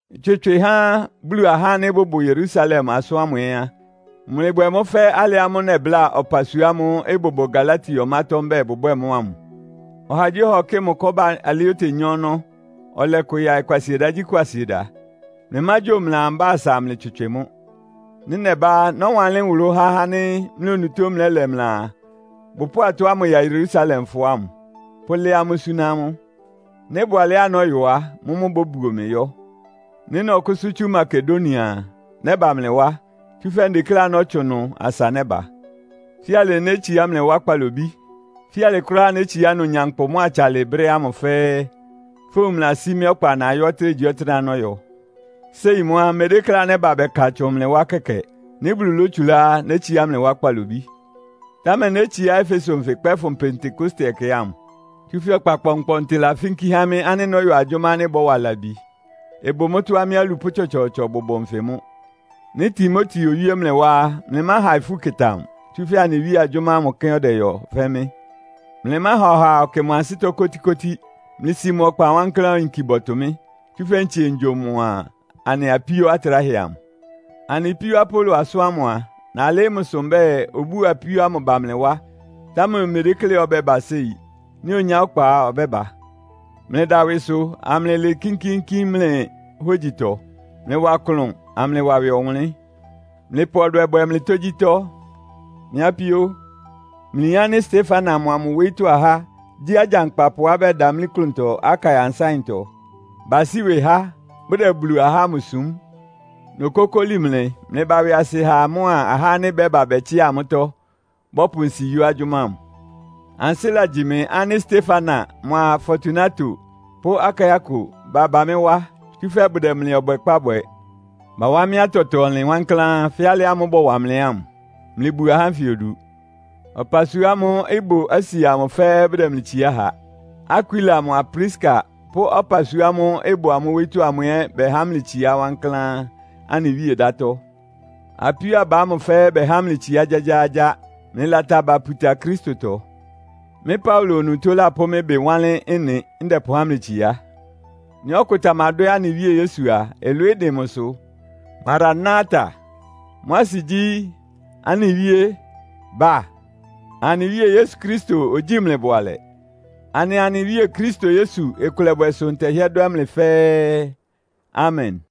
Ɩtswɩtswɩ ha Bulu ahá ánɩ́ bʋbʋ Yerusalem asʋ́n ámʋ ɛ́ á, mlɩbwɛ mʋ́ fɛ́ alɩ ámʋ́ʋ́ nɛbláa ɔpasua ámʋ́ʋ́ ɩbʋbʋ Galatia ɔmátɔ́ mbɛ́ɛ bʋbwɛ́ɛ mʋ́ ámʋ. Ɔhagyíɔha ɔkɩ́ɩ mʋ kɔ́ba alɩá otenyá ɔnɔ́, ɔlɛ kʋ yaɩ Kwasiedagyíkwasieda. Mlɩmágyo mlɩaa mbá asa amlɩtswɩtswɩ mʋ́. Nɩ́ nɛbá á, nɔ́wanlɩ́n nwʋlʋ́ há ahá ánɩ́ mlɩ onutó mlɛ́lɛ mlɩaa, bʋpʋ́ʋ atɔ́ ámʋ ya Yerusalemfɔ ámʋ, pʋ́lɛ́ amʋ́ súná amʋ́. Nɩ́ ɩbʋ alɛ́á nɔ́yɔ á, mʋ́mʋ́ bóbuo mɩ yɔ́. Nɩ́ nɔkʋ́sʋ́ tsú Makedonia a, nɛ́ba mlɩ wá, tsúfɛ́ ndekléá nɔ́tsʋn ɩnʋ asa nɛ́ba. Fíalɩ nétsiá mlɩ wá kpalobí. Fíalɩ kʋ́ráá nétsiá ɩnʋ nyankpʋ mʋ́a atsalɩ brɛ́ ámʋ fɛ́ɛ́, fówun mlɩlasí mɩ́ ɔkpa nayɔ́ ɔtɩ́nɛgyíɔtɩ́nɛ́á nɔ́yɔ. Séi mʋ́ á, mmedékléá nɛ́ba bɛka tsʋn mlɩ wá kɛkɛ. Nɩ́ Bulu lótsulá á, nétsiá mlɩ wá kpalobí. Támɛ nétsiá Efeso nfɩ kpɛ́fʋn Pentekoste ɛkɛ ámʋ. Tsúfɛ́ ɔkpa kpɔnkpɔntɩ lafínkí há mɩ́ ánɩ́ nɔ́yɔ agyʋ́má ánɩ́ ɩbɔ́wa labi. Ɩbʋ mʋ́tɔ́á mɩ́ alupʋ́ tsɔtsɔɔtsɔ bʋbʋ nfɩ mʋ́. Nɩ́ Timoteo owíé mlɩ wá á, mlɩmáha ifú ɩkɩta mʋ, tsúfɛ́ anɩ Wíe agyʋ́má ámʋ kɛ́n ɔdɛyɔ fɛ́ mɩ́. Mlɩmáha ɔhaa ɔkɩ mʋ ansɩ́tɔ́ kótíkótí. Mlɩsi mʋ ɔkpa wankláán oyinki bɔtʋ mɩ́, tsúfɛ́ ntsie ngyo mʋa anɩ apíó atráhɛ amʋ. Anɩ píó Apolo asʋ́n ámʋ a, nalɩ́ɩ́ mʋsʋ mbɛ́ɛ, obúo apíó ámʋ ba mlɩ wá, támɛ omedékléá ɔbɛ́ba séi. Nɩ́ onyá ɔkpa á, ɔbɛ́ba. Mlɩda ɩwɩsʋ, amlɩlɩɩ kínkíínkín mlɩ hógyitɔ. Mlɩwa klʋn, amlɩwa ɩwɩ ɔwʋnlɩ́n. Mlɩpʋ ɔdwɛ bwɛ mlɩ tógyítɔ́. Mɩ́ apíó, mlɩyin ánɩ́ Stefana mʋa mʋ wóyítɔ́ ahá gyí agyankpapʋá bɛdamlí klʋntɔ Akaia nsáɩntɔ. Basí ɩwɩ há, bʋdɛ Bulu ahá ámʋ súm. Nokókóli mlɩ, mlɩba ɩwɩasɩ ha amʋ́a ahá ánɩ́ bɛ́ba bɛtsɩá amʋ́tɔ́, bɔ́pʋ nsi yɔ́ agyʋ́má ámʋ. Ansɩ́ lagyi mɩ ánɩ́ Stefana mʋa Fortunato pʋ́ Akaiko baba mɩ́ wá. Tsúfɛ́ bʋdɛ mlɩ ɔbwɛkpá bwɛ. Bawá mɩ́ atɛtɔ-ɔnlɩn wankláán, fɛ́ alɩ ámʋ́ʋ́ bɔwa mlɩ ámʋ. Mlɩbu ahá ánfɩ odu. Ɔpasua ámʋ́ʋ́ ɩbʋ Asia amʋ fɛ́ɛ́ bʋdɛ mlɩ tsiá ha. Akwila mʋa Priska pʋ́ ɔpasua ámʋ́ʋ́ ɩbʋ amʋ́ wóyítɔ́ amʋ ɛ́ bɛhá mlɩ tsiá wankláán anɩ Wíe ɩdátɔ́. Apíó aba ámʋ fɛ́ɛ́ bɛhá mlɩ itsiá gyágyáágyá. Mlɩlata aba puta Kristotɔ. Mɩ́ Paulo onutó lapʋ́ mɩ́ ɩbɩ wanlɩ́n ɩ́nɩ, ndɛpʋhá mlɩ tsiá. Nɩ́ ɔkʋ tamadwɛ́ anɩ Wíe Yesu a, ɩlwɩɩ́ dɩn mʋsʋ! Marana-ta! (Mʋ́ asɩ gyí, “Anɩ Wíe, ba!”) Anɩ Wíe Yesu Kristo ogyíi mlɩ bʋalɛ. Anɩa anɩ Wíe Kristo Yesu ɩkʋlɛbwɛ sʋ ntɛhɩ́ɛ́ dwɛ́ mlɩ fɛ́ɛ́. Amen!